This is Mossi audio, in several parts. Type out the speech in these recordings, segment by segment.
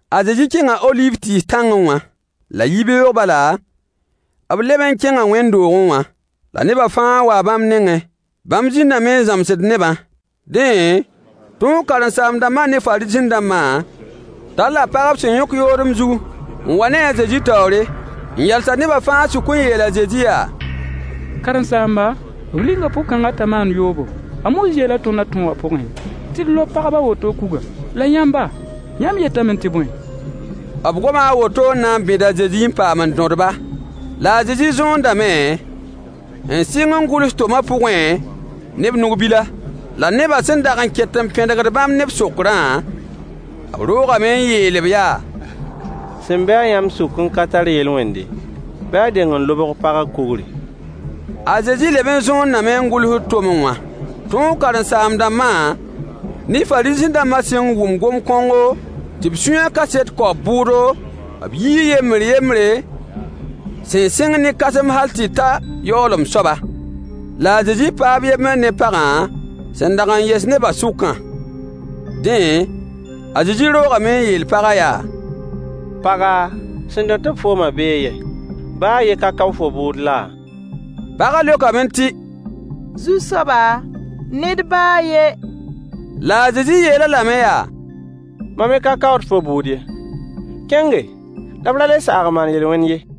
A Zezi kẽnga oliiv tɩɩs tãngẽ wã. La yibeoog bala, b leb n kẽnga wẽnd-doogẽ wã, la nebã fãa waa bãmb nengẽ. Bãmb zĩndame n zãmsd nebã. Dẽ, tõog karen-saam-dãmbã ne Fariisẽ-dãmbã talla pag b sẽn yõk yoodem zug n wa ne-a a Zezi taoore, n yals-a nebã fãa sʋk n yeel a Zezi yaa: Karen-saamba, b linga pʋg-kãngã t'a maand yoobo. A Moyiis yeela tõnd a tõogã pʋgẽ tɩ d lob pagb a woto kuga. La yãmba, yãmb yetame tɩ bõe? B goma a woto n na n bẽd a Zezi n paam n dõd-ba. La a Zezi zõondame n sɩng n gʋls tomã pʋgẽ ne b nug-bila. La nebã sẽn dag n ket n pẽdgd bãmb ne b sokrã, b roogame n yeel-b yaa: Sẽn be-a yãmb sʋk n ka tar yel-wẽnde, bɩ a deng n lobg pagã kugri. A Zezi leb n zõondame n gʋlsd tomẽ wã. Tõog karen-saam-dãmbã ne Fariisẽ-dãmbã sẽn wʋm gom-kõngo, tɩ b sũyã kaset kao b bʋʋdo, b yii yembr yembre, sẽn sɩng ne kãsem hal tɩ ta yaoolem soaba. La a Zezi paa b yembr ne pagã sẽn dag n yɛs nebã sʋkã. Dẽ, a Zezi roogame n yeel pagã yaa: Paga, sẽn dõt-b foomã bee yɛ? Baa a yen ka kao fo bʋʋd laa? Pagã leokame tɩ: Zu-soaba, ned baa a yen. La a Zezi yeel-a lame yaa: Mam me ka kaood fo bʋʋd ye. Kẽnge, la f ra le saag n maan yel-wẽn ye.]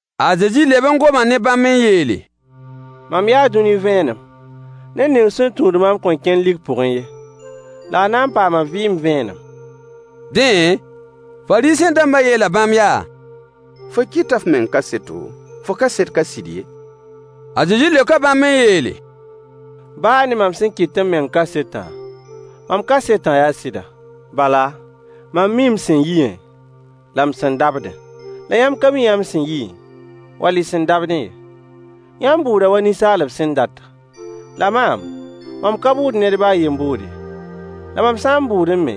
A Zezi leb n goma ne bãmb n yeele: Mam yaa dũni vẽenem. Ned ning sẽn tũud maam kõn kẽn lik pʋgẽ ye, la a na n paama vɩɩm vẽenem. Dẽ, Fariisẽ-dãmbã yeela bãmb yaa: Fo kɩta f meng kaseto, fo kaset ka sɩd ye. A Zezi leoka bãmb n yeele: Baa ne mam sẽn kɩt m meng kasetã, mam kasetã yaa sɩda. Bala, mam mii m sẽn yiẽ, la m sẽn dabdẽ. La yãmb ka mi mam sẽn yiẽ, wall m sẽn dabdẽ ye. Yãmb bʋʋda wa ninsaalb sẽn data. La maam, mam ka bʋʋd ned baa a yen bʋʋd ye. La mam sã n bʋʋdẽ me,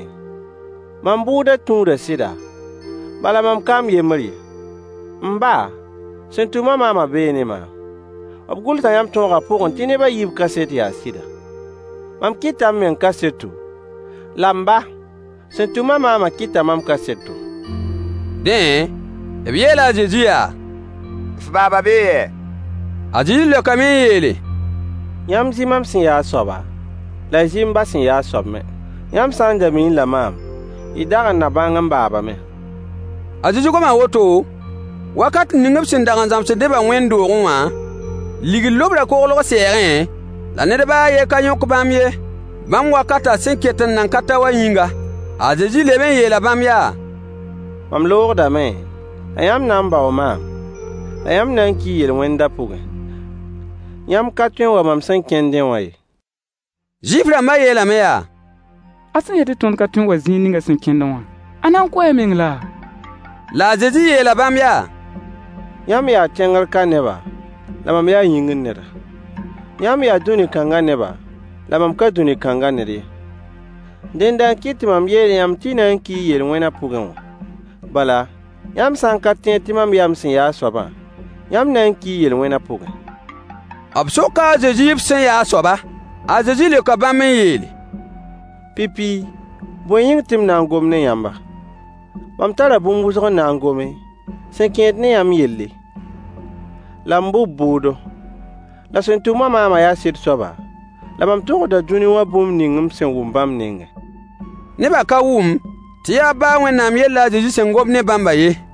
mam bʋʋdã tũuda sɩda, bala mam ka m yembr ye. M ba, sẽn tʋm-a maamã bee ne maam. B gʋlsa yãmb tõogã pʋgẽ tɩ neb a yiib kaset yaa sɩda. Mam kɩta m meng kaseto, la m ba, sẽn tʋm-a maamã kɩta mam kaseto. Dẽ, b yeela a Zezi yaa: F baaba bee yɛ? A Zezi leokame n yeele: Yãmb zɩ mam sẽn yaa a soaba, la y zɩ m ba sẽn yaa a soab me. Yãmb sã n da miiẽ-la maam, y dag n na bãng m baaba me. A Zezi goma woto, wakat ning b sẽn dag n zãmsd nebã wẽnd-doogẽ wã, ligd lobrã koglg sɛɛgẽ, la ned baa a yen ka yõk bãmb ye, bãmb wakatã sẽn ket n nan ka ta wã yĩnga. A Zezi leb n yeela bãmb yaa: Mam loogdame, la yãmb na n baoo maam, la yãmb na n kii y yel-wẽndã pʋgẽ. Yãmb ka tõe n wa mam sẽn kẽndẽ wã ye. Zuif-rãmbã yeelame yaa: A sẽn yet tɩ tõnd ka tõe n wa zĩig ning a sẽn kẽndẽ wã, a na n kʋʋ a meng laa? La a Zezi yeela bãmb yaa: Yãmb yaa tẽngr ka neba, la mam yaa yĩngr neda. Yãmb yaa dũni kãngã neba, la mam ka dũni kãngã ned ye. Dẽnda n kɩt tɩ mam yeel yãmb tɩ y na n kii y yel-wẽnã pʋgẽ wã. Bala, yãmb sã n ka tẽed tɩ mam yaa m sẽn yaa a soabã, yãmb na n kii y yel-wẽnã pʋgẽ. B soka a Zezi b sẽn ya a soaba. A Zezi leoka bãmb n yeele: Pipi, bõe yĩng tɩ m na n gom ne yãmba? Mam tara bũmb wʋsg n na n gome, sẽn kẽed ne yãmb yelle, la m bʋ b bʋʋdo. La sẽn tʋm-a maamã yaa sɩd soaba, la mam togsda dũni wã bũmb ning m sẽn wʋm bãmb nengẽ. Nebã ka wʋm tɩ yaa b ba a Wẽnnaam yell la a Zezi sẽn gomd ne bãmbã ye.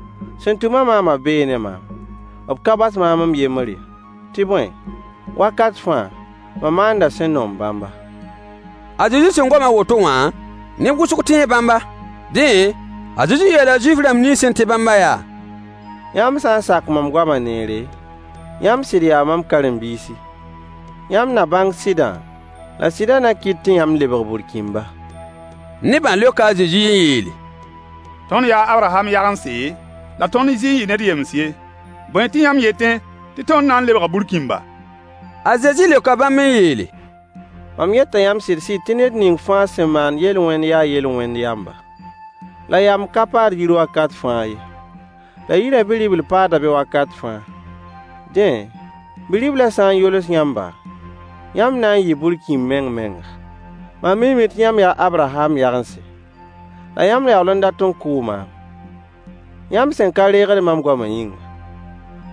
Sẽn tʋm-a maamã bee ne maam. B ka bas maam m yembr ye, tɩ bõe, wakat fãa, mam maanda sẽn noom bãmba. A Zezi sẽn gom a woto wã, neb wʋsg tẽe bãmba. Dẽ, a Zezi yeela Zuif-rãmb nins sẽn tẽ bãmbã yaa: Yãmb sã n sak mam goama neere, yãmb sɩd yaa mam karen-biisi. Yãmb na bãng sɩdã, la sɩdã na kɩt tɩ yãmb lebg burkĩmba. Nebã leoka a Zezi n yeele: Tõnd yaa a Abraham yagense, la tõnd zɩ n yɩ ned yems ye. Bõe tɩ yãmb yetẽ tɩ tõnd na n lebga burkĩmba? A Zezi leoka bãmb n yeele: Mam yeta yãmb sɩd-sɩd tɩ ned ning fãa sẽn maand yel-wẽnd yaa yel-wẽn yamba. La yamb ka paad yir wakat fãa ye. La yirã bi-ribl paada be wakat fãa. Dẽ, Bi-riblã sã n yols yãmba, yãmb na n yɩɩ burkĩmb meng-menga. Mam miime tɩ yãmb yaa a Abraham yagense. La yãmb yaool n dat n kʋʋ maam, yãmb sẽn ka reegd mam goamã yĩnga.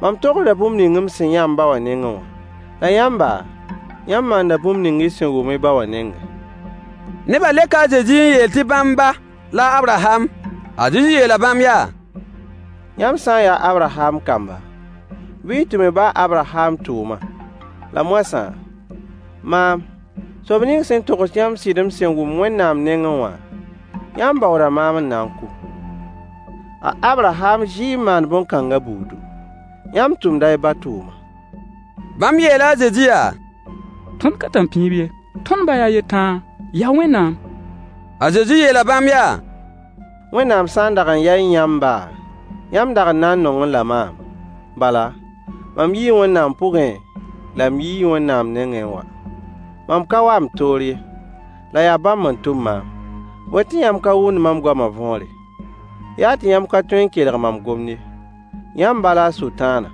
Mam togsda bũmb ning m sẽn yã m ba wã nengẽ wã. La yãmba, yãmb maanda bũmb ning y sẽn wʋm y ba wã nengẽ. Nebã leoka a Zezi n yeel tɩ bãmb ba la a Abraham. A Zezi yeela bãmb yaa: Yãmb sã n yaa a Abraham kamba, bɩ y tʋm y ba a Abraham tʋʋmã. La moasã, maam, soab ning sẽn togs yãmb sɩd m sẽn wʋm Wẽnnaam nengẽ wã, yãmb baooda maam n na n kʋ. A Abraham zɩ n maan bõn-kãngã buudu. Yãmb tʋmda y ba tʋʋma. Bãmb yeela a Zezi yaa: Tõnd ka tãmpĩib ye. Tõnd ba yaa a yen tãa: Yaa Wẽnnaam. A Zezi yeela bãmb yaa: Wẽnnaam sã n dag n yaẽ yãmb ba, yãmb dag n na n nongẽ-la maam, bala, mam yii Wẽnnaam pʋgẽ, la m yii Wẽnnaam nengẽ n wa. Mam ka wa m toor ye, la yaa bãmb n tʋm maam. Bõe tɩ yãmb ka wʋmd mam goamã võore? Yaa tɩ yãmb ka tõe n kelg mam gomd ye. Yãmb ba la Sʋtãanã,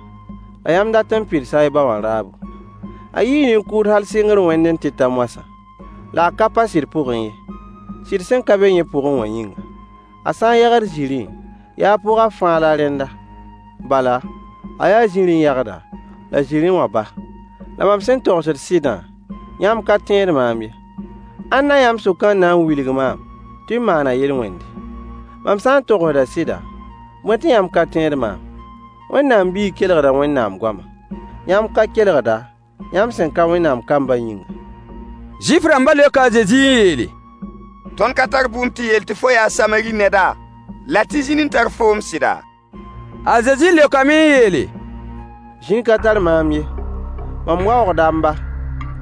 la yãmb dat n pidsa y ba wã raabo. A yɩɩ nin-kʋʋd hal sɩngr wẽndẽ tɩ ta moasã, la a ka pa sɩd pʋgẽ ye, sɩd sẽn ka be yẽ pʋgẽ wã yĩnga. A sã n yagd zĩrĩ, yaa a pʋga fãa la rẽnda, bala, a yaa zĩrĩ yagda, la zĩrĩ wã ba. La mam sẽn togsd sɩdã, yãmb ka tẽed maam ye. Ãnna yãmb sʋkã n na n wilg maam tɩ m maana yel-wẽnde? Mam sã n togsda sɩda, bõe tɩ yãmb ka tẽed maam? Wẽnnaam biig kelgda Wẽnnaam goama. Yãmb ka kelgda, yãmb sẽn ka Wẽnnaam kambã yĩnga. Zuif-rãmbã leoka a Zezi n yeele: Tõnd ka tar bʋʋm tɩ yeel tɩ fo yaa Samari neda, la tɩ zĩn n tar foom sɩda? A Zezi leokame n yeele: Zĩn ka tar maam ye. Mam waoogda m ba,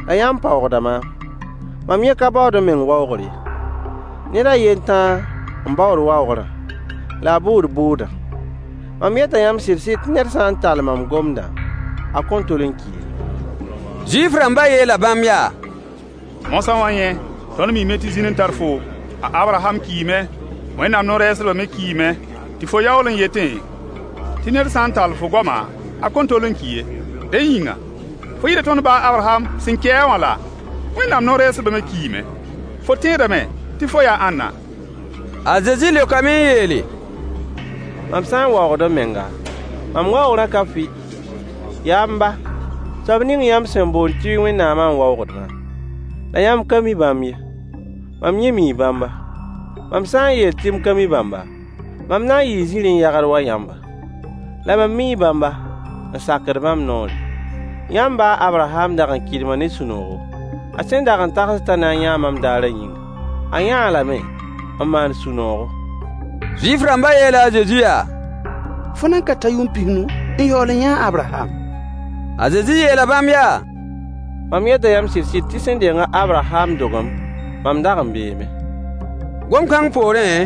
la yãmb paoogda maam. Mam yẽ ka baood m meng waoogr ye. Ned a yen tãa n baood waoogrã, la a bʋʋd bʋʋdã. Mam yeta yãmb sɩd-sɩd tɩ ned sã n tall mam gomdã, a kõn tol n ki ye. Zuif-rãmbã yeela bãmb yaa: Moasã wã yẽ, tõnd miime tɩ zĩn n tar foom. A Abraham kiime, Wẽnnaam no-rɛɛsdbã me kiime, tɩ fo yaool n yetẽ tɩ ned sã n tall fo goama a kõn tol n ki ye. Dẽ yĩnga, fo yɩɩda tõnd ba a Abraham, sẽn ki-a wã laa? Wẽnnaam no-rɛɛsdbã me kiime. Fo tẽedame tɩ fo yaa ãnna? A Zezi leokame n yeele: Mam sã n waoogd m menga, mam waoogrã ka fɩ. Yaa m ba, soab ning yãmb sẽn boond tɩ y Wẽnnaamã n waoogd maam. La yãmb ka mi bãmb ye. Mam yẽ mii bãmba. Mam sã n yeel tɩ m ka mi bãmba, mam na n yɩɩ zĩrĩ yagd wa yãmba. La mam mii bãmba, n sakd bãmb noore. Yãmb ba a Abraham dag n kɩdma ne sũ-noogo, a sẽn dag n tagsd t'a na n yãa mam daarã yĩnga. A yãa-a lame, n maan sũ-noogo. Zuif-rãmbã yeela a Zezi yaa: Fo nan ka ta yʋʋm pis-nu, n yaool n yã a Abraham? A Zezi yeela bãmb yaa: Mam yeta yãmb sɩd-sɩd tɩ sẽn deng a Abraham dogem, mam dag n beeme. Gom-kãng poorẽ,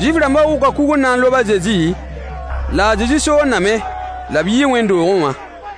Zuif-rãmbã wʋka kug n na n lob a Zezi, la a Zezi soondame, la b yii wẽnd-doogẽ wã.